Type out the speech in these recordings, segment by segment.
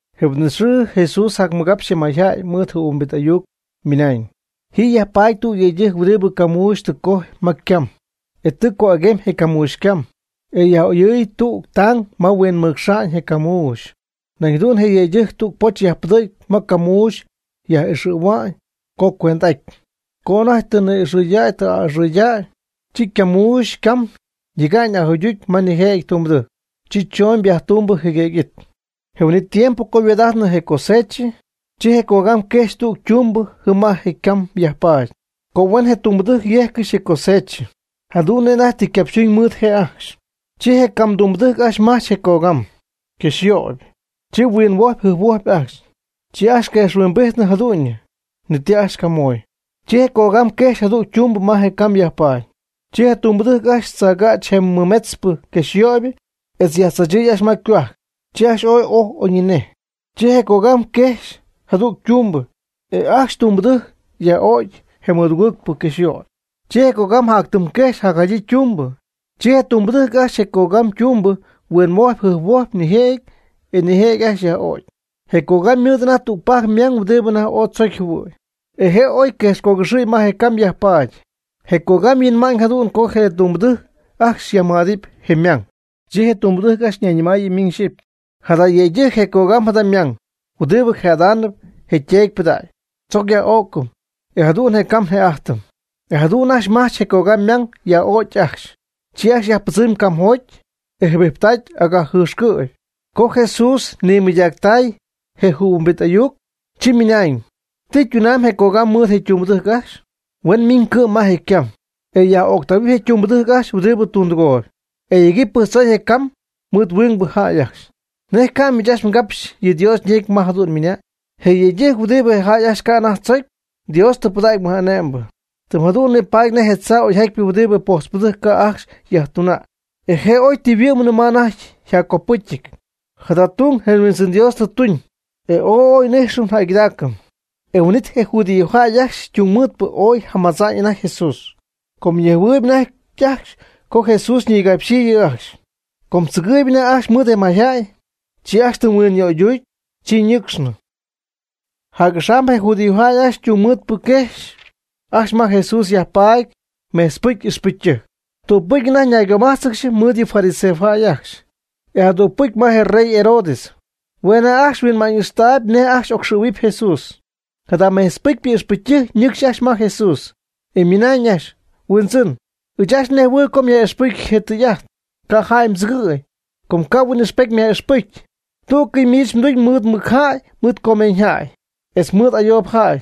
Je huin'it xɨɨ Jesús jacmɨgapxy je mayjäy mɨɨd jɨhuimbit ayuc, ymɨnañ: ―Ji yajpaady tüg yëydɨjc huɨdibɨ camuuxy tɨ cojy ma ycam, e tɨ co'aguemy je camuuxy cam, e yaj'oyɨɨy tügɨ tang ma huinmɨcxa'ñ je camuuxy. Nañ jadu'n je yëydɨjc tüg poch yajpɨdɨ̈gy ma ycamuuxy yaj'ixɨ̈hua'ñ co cuent'aty. Co anajty tɨ ni'ixɨ̈däy tɨ a'ɨxɨ̈däy, chi ycamuuxy cam yejcy ajuyducy ma nijëjɨty tumbɨdɨjc. Chi chooñ viaje tumbɨ jɨguëgy it. Je huin'it tiempo co yhuaad'ajtnɨ je cosechɨ, chi je cogam quejxy tüg ytumbɨ jɨm ma je' ycam yajpaady, co hueen je tumbɨdɨjc yéjccɨxy je cosechɨ, jadu'n nej anajty tɨ ycapxytuñ mɨɨd je' ajcxy. Chi je cam tumbɨdɨjc ajcxy majch je cogam yquexyöyp, chi huinhuojpy jɨjphuojpy ajcxy. Chi ajcxy quejxhuimbijty jadu'ñyɨ, ni ti ajcxy camoy. Chi je cogam quejxy jadüg ytumbɨ ma je ycam yajpaady. Chi tumbɨdɨjc ajcxy tzaagäch je mɨmetzpɨ quexyöyp etz yajtzachɨy ajcxy ma ycohuajc, chi ajcxy ooy ojy oyñinej. Chi je cogam jacquejxy jadüg ytumbɨ e ajcxy tumbɨdɨjc yaj'o'cy je mɨdugɨɨgpɨ quexyöpy. Chi je cogam jac tɨm quejxy jadyii ytumbɨ. Chi je tumbɨdɨjc ajcxy je cogam ytumbɨ huinhuojpɨ jɨjphuojpɨ nijëjɨty, e nijëjɨty ajcxy yaj'o'cy. Je cogam ymɨɨd anajty tügpajc ymang huɨdibɨ anajty ooy tzocy jɨhuɨy. Je' oy quejxcogɨxɨ̈y ma je ycam yajpaady. Je cogam huinmay jadu'n co je tumbɨdɨjc ajcxy yajmɨj'adɨɨyb je' ymang. Chi je tumbɨdɨjc ajcxy ñayñɨmaayɨ miñ xyɨpy: “Jada yëydɨjc je cogam jada ymang huɨdibɨ jë'adaanɨp je yteedy ypɨdägy. Tzoc yaj'ó'cɨm, e jadu'n je cam një'ájtɨm.” E jadu'n ajcxy majch je cogam ymang yaj'ögy ajcxy. Chi ajcxy yajpɨdzɨmy camjoty, e jɨbijptacy agajjɨxcɨ'py. Co Jesús jadu'n mɨydactay je jɨhuimbit ayuc, chi ymɨnañ: ―¿Ti ytunamyb je cogam mɨɨd je tumbɨdɨjc ajcxy? Hue' min cɨ'm ma je' ycam, e yaj'öctähuɨpy je tumbɨdɨjc ajcxy huɨdibɨ tundɨgoy. E yegɨpy pɨjctzoy je' ycam mɨɨd huingbɨ jäy ajcxy. ¿Nej ca'nɨ miich ajcxy mgapxy yɨ Dios ñecy ma jadu'n ymɨnañ? Je yëydɨjc huɨdibɨ je jäy ajcxy ca' anajty tzocy, Dios tɨ pɨdägy mɨj'ane'mbɨ. Tɨm jadu'n nipaady nej tzaa oyjatypɨ huɨdibɨ je pojtzpɨdɨjc ca' ajcxy yajtuna'ñ, e je' oy tɨ yhuɨ'mnɨ ma anajty yjaccopɨ́cyɨty. Jada tung je Huindzɨn Dios tɨ tuñ, e ooy oy n'íjxɨm njäygɨdaacɨm. E huin'it je judíojäy ajcxy ytungmɨɨdpɨ ooy jamadzaañ anajty Jesús, com ñejhuɨɨyb anajty ajcxy co Jesús ñigapxyii yɨ' ajcxy. Com tzɨgɨɨyb anajty ajcxy mɨɨd je mayjäy, chi ajcxy tɨm huinyöyducy, chi ñɨ́cxcɨxnɨ. Jac'axam je judíojäy ajcxy ytungmɨɨdpɨ quejxy ajcxy ma Jesús yajpaady mejtzpɨcy ixpɨcytɨjc. Tügpɨcy anajty ñaygomájtzɨgɨxy mɨɨd yɨ fariseos ajcxy, etz jadügpɨcy ma je rey Herodes. Hue' anajty ajcxy huinma'ñ ixtaayb nej ajcxy ocxɨ̈huɨpy Jesús. Jada mejtzpɨcypɨ ixpɨcytɨjc ñɨcxy ajcxy ma Jesús, e ymɨnañ ajcxy: ―Huindzɨn, ɨɨch ajcxy nejhuɨɨyb co myaj'ixpɨjcy je tɨy'ajt, ca' jäy mdzɨgɨ̈y, com ca' huin'ijxpety myaj'ixpɨcy. Tú'cɨy miich mduñ mɨɨd mɨc jäy, mɨɨd comeeñyjäy, etz mɨɨd ayoob jäy.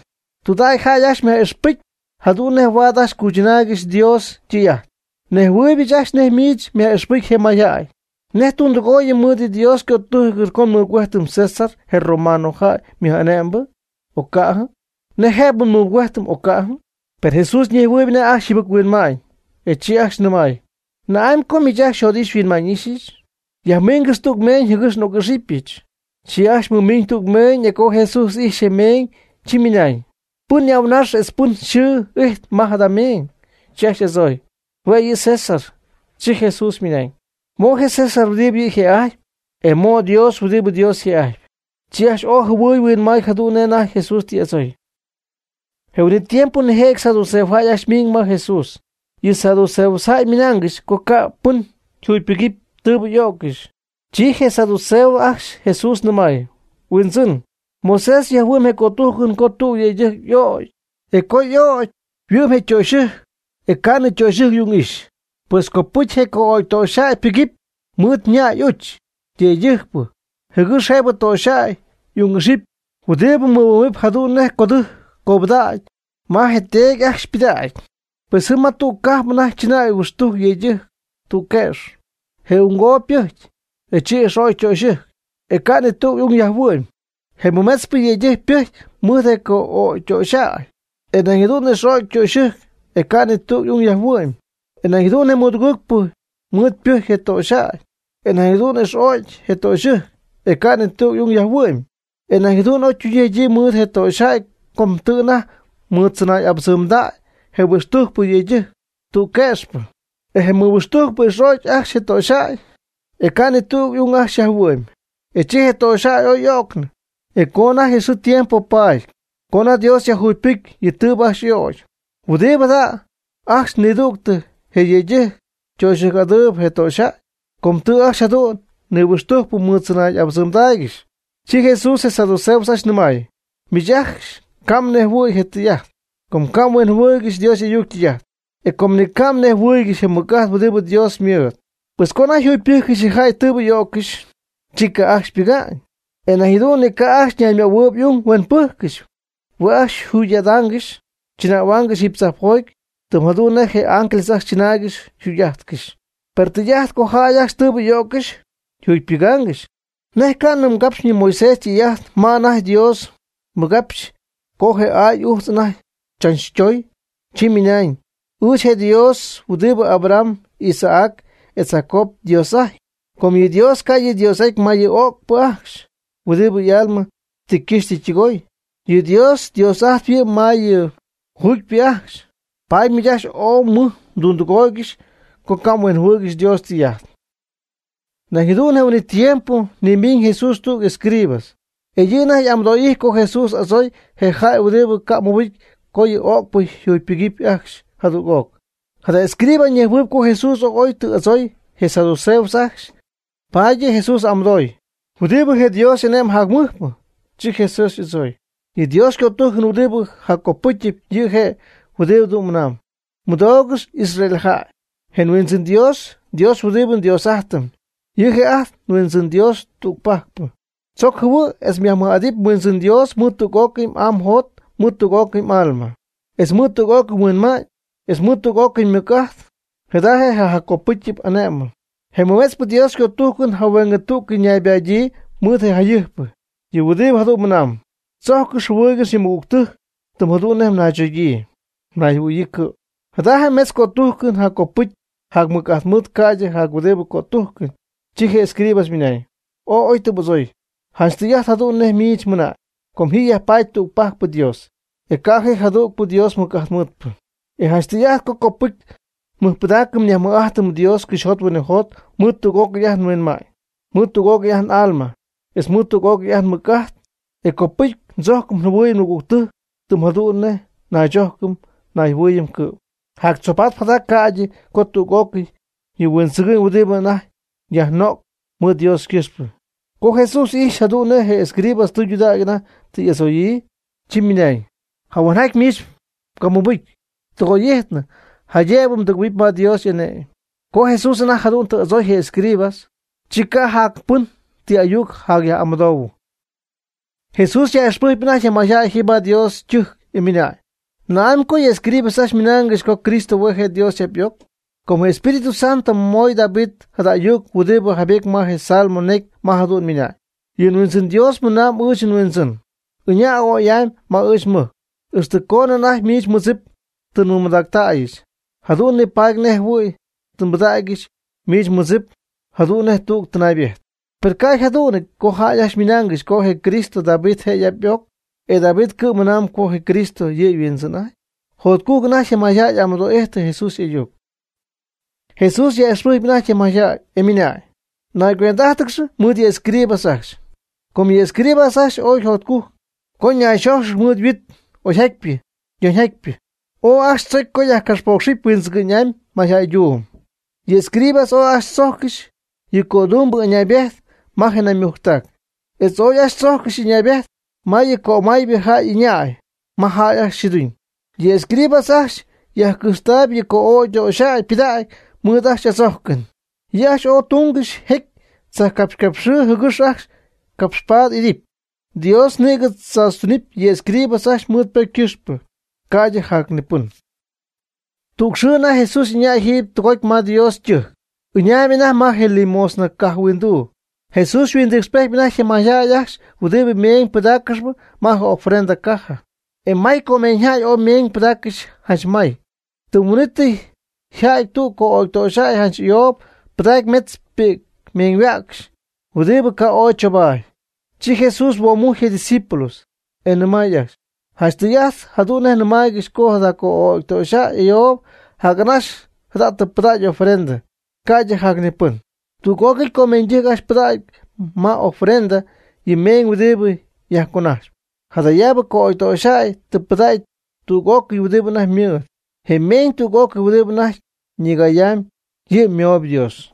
Tudägy jäy ajcxy myaj'ixpɨcy jadu'n nej huaad ajcxy cuychɨnaaygɨxy Dios ytɨy'ajt. Nejhuɨ̈huaamybɨch ajcxy nej miich yaj'ixpɨjcpy je mayjäy. ¿Nej tundɨgooyɨm mɨɨd yɨ Dios ycötújcɨn co nmɨgüéjtɨm César, je romano jäy mɨj'ane'mbɨ, o ca'jɨ? ¿Nej jëb nmɨgüéjtɨm, o ca'jɨ? Per Jesús ñejhuɨɨyb anajty ajcxy yjɨbɨc-huinma'ñ, e chi ajcxy nɨmay: ―¿Na'amy co miich ajcxy xyjot'ixy xyhuinma'ñ'íxyɨch? Yajmiingɨx tüg meeñ jɨgɨx n'oc'ixɨpyɨch. Chi ajcxy mɨmiiñ tüg meeñ e co Jesús ijxy je meeñ, chi ymɨnañ: ―¿Pɨn y'ahuanax etz pɨn yxɨɨ ijtp ma jada meeñ? Chi ajcxy y'adzooy: ―Hue' yɨ' César. Chi Jesús ymɨnañ: ―Mo' je César huɨdibɨ yɨ' yjë'ajtpy, e mo' Dios huɨdibɨ Dios yjë'ajtpy. Chi ajcxy ooy jɨhuɨy huinmay jadu'n nej anajty Jesús tɨ y'adzooy. Je huin'it tiempo nijëjɨty saduceos ajcxy ymiiñ ma Jesús. Yɨ saduceos ajcxy ymɨnaangɨxy co ca' pɨn yjugypɨga'ñ tɨɨbɨ y'o'ccɨxy. Chi je saduceos ajcxy Jesús nɨmay: ―Huindzɨn, Moisés jayhuɨ'my je cötújcɨn co tüg yëydɨjc y'ögy, e co'ögy yhuɨ'my je ytöxyɨjc e ca'nɨ ytöxyɨjc ung'ixy. Pues copɨcy je co'ögy ytöxyjäy ypɨgɨpy mɨɨd ña'y y'uch yëydɨjcpɨ jɨgɨx jëbɨ je töxyjäy y'ung'ixɨpy huɨdibɨ huɨ'mɨ̈huɨp jadu'n nej codɨjc cobɨdägy ma je yteedy y'ajch ypɨdägy. Pues jɨm ma tüg cajp anajty chɨnäy huɨxtujc yëydɨjc tüg que'x. Je ungoob ypɨjcy, e chi ix'o'cy ytöxyɨjc, e ca' ni tüg y'ung yajhuɨ'my. Je mɨmetzpɨ yëydɨjc ypɨjcy mɨɨd je co'ögytöxyjäy, e nañ jadu'n ix'o'cy ytöxyɨjc e ca' ni tüg ung yajhuɨ'my. E nañ jadu'n je mɨdugɨɨgpɨ mɨɨd ypɨjcy je töxyjäy, e nañ jadu'n ix'o'cy je ytöxyɨjc, e ca' ni tüg y'ung yajhuɨ'my. E jadu'n oytuñyii yjadyii mɨɨd je töxyjäy co tɨ anajty mɨɨddzɨnay'abɨdzɨmdäy je nihuɨxtujcpɨ yëydɨjc tüg que'xpɨ. E je nihuɨxtujcpɨ ix'o'cy ajcxy je töxyjäy, e ca' ni tüg y'ung ajcxy yajhuɨ'my. E chi je töxyjäy oy y'öcnɨ. E co anajty xɨɨ tiempo paaty, co anajty Dios yajjugypɨcy yɨ tɨɨbɨ ajcxy y'ögy, ¿huɨdibɨ jada' ajcxy nidüctɨ je yëydɨjc töxyɨjc'adaanɨp je töxyjäy? Com tɨ ajcxy jadu'n nihuɨxtujcpɨ mɨɨd tzɨnay'abɨdzɨmgɨxy. Chi Jesús je saduceos ajcxy nɨmay: ―Miich ajcxy ca' mhuinjɨhuɨ̈y je tɨy'ajt, com ca' mhuinjɨhuɨɨygɨxy Dios y'ayuc ytɨy'ajt, e com ni ca' mnejhuɨɨygɨxy je mɨc'ajt huɨdibɨ Dios ymɨɨd. Pues co anajty yjugypɨ́jccɨxy je jäy tɨɨbɨ y'ó'ccɨxy, chi ca' ajcxy ypɨga'ñ, e nañ jadu'n ni ca' ajcxy ñaymöhuɨɨyb y'ung huen pɨ́jccɨxy. Hue' ajcxy yjugy'adaangɨxy chɨnähuaangɨxy jiiby tzajpjoty, tɨm jadu'n nej je ángel ajcxy chɨnaaygɨxy yjugy'ájtcɨxy. Per je tɨy'ajt co jäy ajcxy tɨɨbɨ y'o'ccɨxy yjugypɨgaangɨxy, ¿nej ca'nɨ mgapxynɨ Moisés ytɨy'ajt ma anajty Dios ymɨgapxyii co je aay ujtz anajty chachtoy? Chi ymɨnañ: “Ɨɨch je' je Dios huɨdib Abraham, Isaac etz Jacob yDios'ajtpy.” Com yɨ Dios ca' yɨ' yDios'aty ma yɨ öcpɨ ajcxy huɨdibɨ y'alma tɨ ycɨxy tɨ ytɨgoy. Yɨ Dios Dios'ajtp yɨ' ma yɨ juugypɨ ajcxy. Paady miich ajcxy ooy mɨj mdundɨgooygɨxy co ca' mhuinjɨhuɨɨygɨxy Dios ytɨy'ajt. Nañ jadu'n je huin'it tiempo nimiiñ Jesús tüg escriba. E yɨ' anajty y'amɨdo'ijtpy co Jesús adzooy je jäy huɨdibɨ ca' mɨbɨcy co yɨ öcpɨ yjugypɨgɨpy ajcxy jadüg'oc. Jada escriba ñejhuɨɨyb co Jesús ooy oy tɨ y'adzooy je saduceos ajcxy, paady yɨ' Jesús amɨdooyɨ: ―¿Huɨdibɨ je' Dios y'ané'mɨn jacmɨjpɨ? Chi Jesús y'adzooy: ―Yɨ Dios ycötújcɨn huɨdibɨ jaccopɨcyɨp, yɨ' je' huɨdibɨ mɨnamb: “Mɨdoogɨx Israel jäy, je Huindzɨn Dios huɨdibɨ nDios'ájtɨm, yɨ' je' ajt nHuindzɨn Dios tügpajcpɨ. Tzoc jɨhuɨ' etz yajmɨj'at mHuindzɨn Dios mɨɨd tüg'ócɨy m'aa mjot etz mɨɨd tüg'ócɨy m'alma, etz mɨɨd tüg'ócɨy mhuinma'ñ, etz mɨɨd tüg'ócɨy mmɨc'ajt.” Jada je' je jaccopɨ́cyɨp ané'mɨn. Je mɨmetzpɨ Dios ycötújcɨn jahueengɨ tú'cɨy ñaybadyii mɨɨd je jayɨjpɨ, yɨ' huɨdibɨ jadu'n mɨnamb: “Tzojccɨx jɨhuɨɨygɨx yɨ mmɨgügtɨjc tɨm jadu'n nej mnaychogyii mnayjɨhuɨ̈yii cɨ'm.” Jada metz Dios ycötújcɨn jaccopɨcy jacmɨc'ajt mɨɨd ca'ydɨ jac huɨdibɨ cötújcɨn. Chi je escriba ymɨnañ: ―Ooy oy tɨ m'adzooy. Janch tɨy'ajt jadu'n nej miich mɨna'ñ, co ji yajpaady tügpajcpɨ Dios, e ca' ji jadüg Dios mɨc'ajt mɨɨdpɨ. E janch tɨy'ajt co copɨcy nmɨjpɨdaacɨm nyajmɨj'ájtɨm Dios cɨxyjot huinɨjot mɨɨd tüg'ócɨy ajt nhuinma'ñ, mɨɨd tüg'ócɨy ajt n'alma, etz mɨɨd tüg'ócɨy ajt nmɨc'ajt. E copɨcy ndzójcɨm njɨhuɨɨyɨm nmɨgügtɨjc tɨm jadu'n nej naychójcɨm nayjɨhuɨɨyɨm cɨ'm. Jactzoobatp jada ca'ydɨ co tüg'ócɨy yɨ huindzɨgɨ'ñ huɨdibɨ anajty yajno'cpɨ mɨɨd Dios ycɨxpɨ. Co Jesús ijxy jadu'n nej je escriba tɨydudägy anajty tɨ y'adzoyii, chi ymɨnañ: ―Jahuenjaty miich mmɨbɨ́jcɨn ytɨgoy'ityñɨ jaydëb mdɨgɨ̈huɨpy ma Dios y'ane'my. Co Jesús anajty jadu'n tɨ y'adzooy je escriba, chi ca' jac pɨn ti ayuc yjacyaj'amɨdoohuɨ. Jesús yaj'ixpɨjcpy anajty je mayjäy jiiby ma Dios ytɨjc, e ymɨnañ: ―¿Na'amy co yɨ escribas ajcxy ymɨnaangɨxy co Cristo hue' je' David y'ap y'oc? Com je Espíritu Santo ymoy David jada ayuc huɨdibɨ jaybety ma je Salmo necy ma jadu'n ymɨnañ: Yɨ Huindzɨn Dios nɨmay ɨɨch nHuindzɨn: “Ɨña' ya a'oy'amy ma ɨɨch nmɨjc, ixtɨ coonɨ anajty miich mmɨdzip tɨ nmɨmadactäyɨch, jadu'n nipaadɨpy nej jɨhuɨ̈y tɨ nbɨdägyɨch miich mmɨdzip jadu'n nej tüg tɨnaybejt.” ¿Per nej co yjadu'nɨty co jäy ajcxy ymɨnaangɨxy co je Cristo David je' y'ap y'oc? ¿E David cɨ'm ymɨnañ co je Cristo yɨ' yHuindzɨn'ajtpy? Jotcujc anajty je mayjäy amɨdoo'ijtɨ Jesús y'ayuc. Jesús yaj'ixpɨjcpy anajty je mayjäy, e ymɨnañ: ―Naycuend'ájtɨgɨx mɨɨd yɨ escribas ajcxy. Com yɨ escribas ajcxy ooy jotcujc co nayxójxɨgɨxy mɨɨd yhuit oyjatypɨ yoñjatypɨ. Ooy ajcxy tzocy co yajcapxpócxcɨxɨpy huindzɨgɨ'ñ'amy mayjäyduum. Yɨ escribas ooy ajcxy tzójccɨxy yɨ cödumbɨ ɨñaybejt ma je naymujctac, etz ooy ajcxy tzójccɨxy ɨñaybejt ma yɨ cömaybɨ jäy ɨñay ma jäy ajcxy yxɨɨduñ. Yɨ escribas ajcxy yajcɨjxtaayɨpy yɨ co'ögy ytöxyjäy ypɨdägy mɨɨd ajcxy y'adzójcɨn. Yɨ' ajcxy ooy túngɨxy jecy tzajpcapxycapxɨɨ jɨgɨx ajcxy capxpaady idɨpy. Dios nïgɨ tzaachytunɨpy yɨ escribas ajcxy mɨɨd ypocy ycɨxpɨ, ca'ydɨ jac ni pɨn. Tüg xɨɨ anajty Jesús ɨñay jiiby tɨgoty ma Dios ytɨjc. Ɨñaayb anajty ma je limosna caja huinduu. Jesús yhuindɨɨcxyp anajty je jäy ajcxy huɨdibɨ meeñ pɨdaaccɨxp ma je ofrenda caja. E maycomeeñyjäy ooy ymeeñ pɨdaaccɨxy janch may. Tɨm huin'ítɨy yja'ty tüg co'ögy töxyjäy janch ayoob pɨdacy metz pi'c meeñyhuäcxy, huɨdibɨ ca' ooy choobaady. Chi Jesús huoomujcy je' ydiscípulos, e nɨmay ajcxy: ―Janch tɨy'ajt jadu'n nɨmaaygɨxy co jada co'ögy ytöxyjäy ayoob jac'anaxy jada tɨ pɨdägy ofrenda, ca'ydɨ jac ni pɨn. Tüg'ócɨy comeeñydɨjc ajcxy ypɨdacpy ma y'ofrenda yɨ meeñ huɨdibɨ yajconajxyp. Jadayaabɨ co'ögytöxyjäy tɨ pɨdacy tüg'ócɨy huɨdibɨ anajty ymɨɨd, je meeñ tüg'ócɨy huɨdibɨ anajty ñigayamy yɨ' ymooyb Dios.